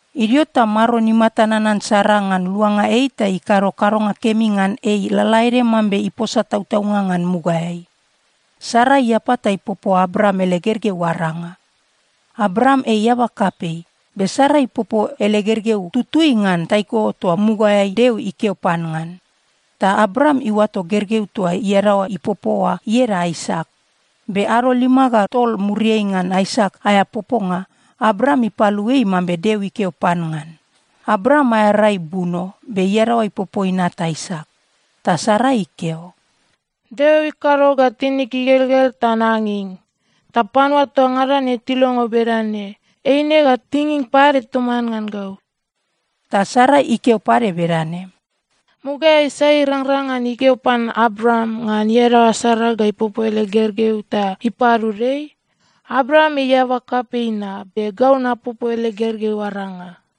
Idio ta Maron imata nanan Sara ngan luanga ei ta ikado kadonga kemi ngan ei lalaede mambe iposa tautaunga ngan mugaeai. Sara iapa ta ipopo Abraam ele gergeu aranga. Abraam ei eaba kapei, be Sara ipopo ele gergeu tutui ngan taiko toa mugaeai Deo ikeo pan ngan. Ta Abraam iuato gergeu toa iadaoa ipopo oa ieda Aisak. Be ado lima ga tol muriai ngan Aisak aea poponga, Abraam ipalu ei mambe Deo ikeo pan ngan. Abraam aea rai buno, be iadaoa ipopo inat Aisak. Ta Sara ikeo, “Deo ikado ga tinig igelgel ta nanging. Ta panua toa ngada ne tilongo bedane, eine ga tinging pade toman ngan gau.” Ta Sara ikeo pade bedane, “Mugaeai sai irangrang ngan ikeo pan Abraam ngan iadaoa Sara ga ipopo ele gergeu ta ipadud ei? Abraam ei eaba kapei na, be gau napopo ele gergeu aranga!”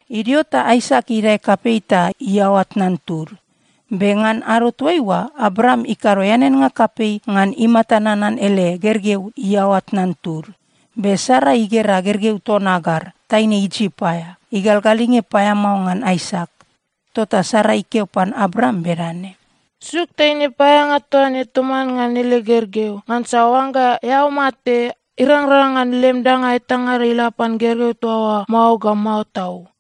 Idio ta Aisak idae kapei ta iaoa tnan tud. Be ngan ado toaiua, Abraam ikado eaneannga kapei ngan imata nanan ele gergeu iaoa tnan tud. Be Sara igera gergeu ton Agar, taine Isip aea, igalgalinge paeamao ngan Aisak. Tota Sara ikeo pan Abraam bedane, “Suk taine paeaeanga toa ne toman ngan ele gergeu! Ngansa oangga eao mate, irangrang ngan lem danga etangada ila pan gergeu toa oa mao ga mao tau.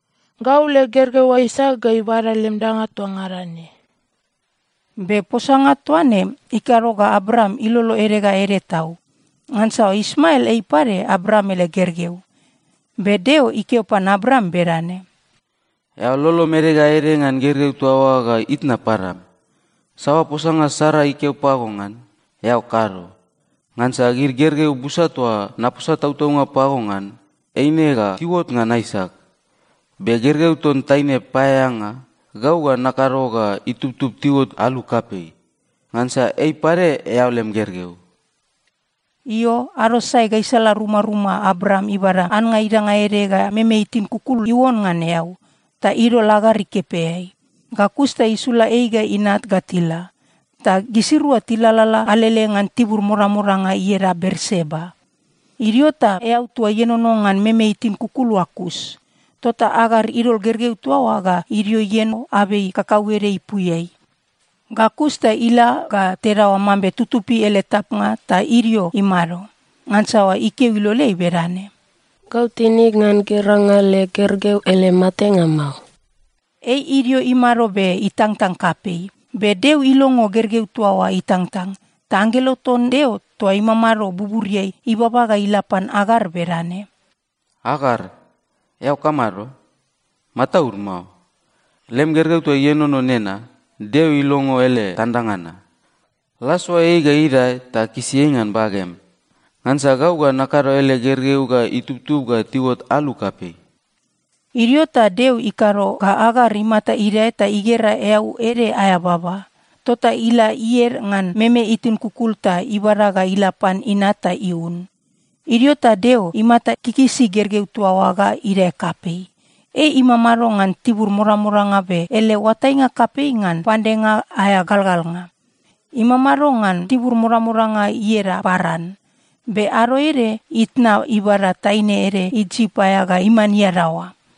Gau leg gergeu Aisak ga ibada lem danga toa ngada ne.” Be posanga toa ne ikado ga Abraam ilolo ede ga ede tau, ngansa Ismael ei pade Abraam ele gergeu. Be Deo ikeo pan Abraam bedane, “Eao lolom ede ga ede ngan gergeu toa oa ga itna padam. Saoa posanga Sara ikeo pago ngan, eao kado, ngansa gid gergeu busa toa naposa tautaunga pago ngan, eine ga tiuot ngan Aisak. Be gergeu ton taine paeaeanga, gau ga nakado ga itubtub tiuot alu kapei, ngansa ei pade eao lem gergeu.” Io, ado sae gaisala rumaruma Abraam ibada annga idanga ede ga meme itin kukul iuon ngan eau, ta idol Agar ikepeai. Ga kus ta isula ei ga inat ga tila. Ta gisirua tilalala alele ngan tibur modamodanga ieda Berseba. Idio ta eau toa ienono ngan meme itin kukul oa kus. Tota Agar idol gergeu toa oa ga idio ieno abei kakauede ipuiai. Ga kus ta ila ga tedaoa mambe tutupi ele tapnga ta idio imado. Ngansa ikeo iloleai bedane, “Gau tinig ngan geranga leg gergeu ele matenga mao.” Ei idio imado be itangtang kapei. Be Deo ilongo gergeu toa oa itangtang, ta anggelo ton Deo toa imamado buburiai ibaba ga ila pan Agar bedane, “Agar, eao kamado? Mataud mao. Lem gergeu toa ienono nena, Deo ilongo ele tandanga na. La soa ei ga idae ta kisi ei ngan bagem. Ngansa gau ga nakado ele gergeu ga itubtub ga tiuot alu kapei.” Idio ta Deo ikado ga Agar imata idae ta igera eau ede aea baba. Tota ila ied ngan meme itin kukul ta ibada ga ila pan inat ta iun. Idio ta Deo imata kikisi gergeu toa oa ga idae kapei. Ei imamado ngan tibur modamodanga be ele oatainga kapei ngan pandenga aea galgalnga. Imamado ngan tibur modamodanga ieda Paran. Be ado ede, itna ibada taine ede Isip aea ga iman iadaoa.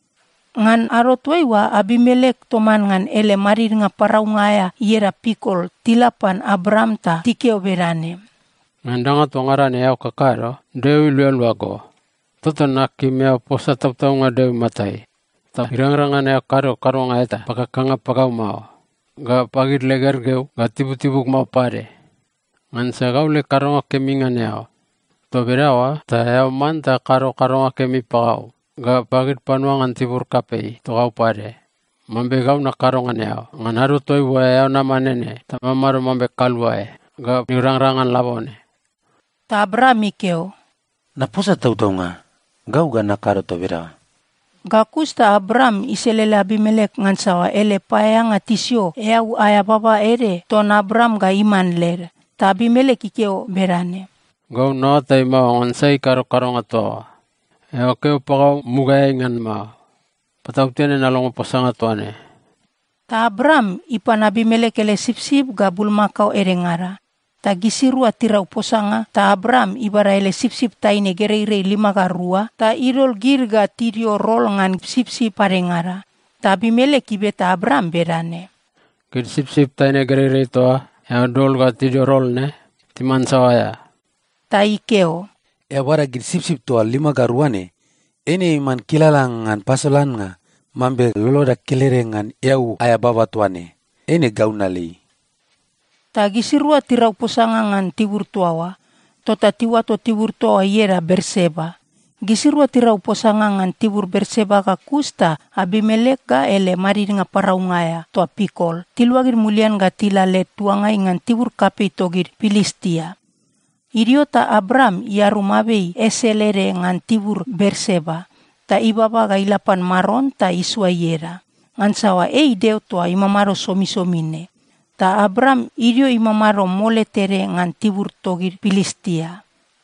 Ngan ado toaiua, Abimelek toman ngan ele madidnga paraunga aea ieda Pikol tila pan Abraam ta tikeo bedane, “Ngan danga toa ngada ne eao kakado, Deo ilualua go. Tota nakim eao posa tautaunga Deo imatai, ta irangrang ngan eao kado kadonga eta pakakanga pagau mao, ga pagid leg gergeu ga tibutibug mao pade. Ngansa gau leg kadonga kemi ngan eao. Toa bedaoa ta eao manta kado kadonga kemi pagau ga pagid panua ngan tibur kapei togau pade, mambe gau nakado ngan eao ngan ado toaiua eao nama nene ta mamado mambe kaluae ga irangrang ngan labone.” Ta Abraam ikeo, “Naposa tautaunga. Gau ga nakado toa bedaoa.” Ga kus ta Abraam iselele Abimelek, ngansa ele paeaeanga tisio eau aea baba ede ton Abraam ga iman led. Ta Abimelek ikeo bedane, “Gau naoatai mao ngan sai ikado kadonga toa oa. Eao keo pagau mugaeai ngan mao. Patautene nalongo posanga toa ne.” Ta Abraam ipan Abimelek ele sipsip ga bulmakao edengada, ta gisirua tirau posanga. Ta Abraam ibada ele sipsip taine gereirei lima ga rua, ta idol gid ga tidio rol ngan sipsip padengada. Ta Abimelek ibeta Abraam bedane, “Gid sipsip taine gereirei toa eao dol ga tidio rol ne timan saoa aea?” Ta ikeo, “Eao bada gid sipsip toa lima ga rua ne. Eine iman kilala ngan pasolannga mambe loloda kelede ngan eau aea baba toa ne, eine gau nalei.” Ta gisirua tirau posanga ngan tibur toa oa. Tota tiuato tibur toa oa ieda Berseba. Gisirua tirau posanga ngan tibur Berseba ga kus ta Abimelek ga ele madidnga paraunga aea, toa Pikol, tiluagid mulian ga tila led tuangai ngan tibur kapei togid Pilistia. Idio ta Abraam iarum abei esel ede ngan tibur Berseba, ta ibaba ga ila pan Maron ta isoa ieda. Ngansa ei Deo toa imamado somisomi ne. Ta Abraam idio imamado mole tede ngan tibur togid Pilistia.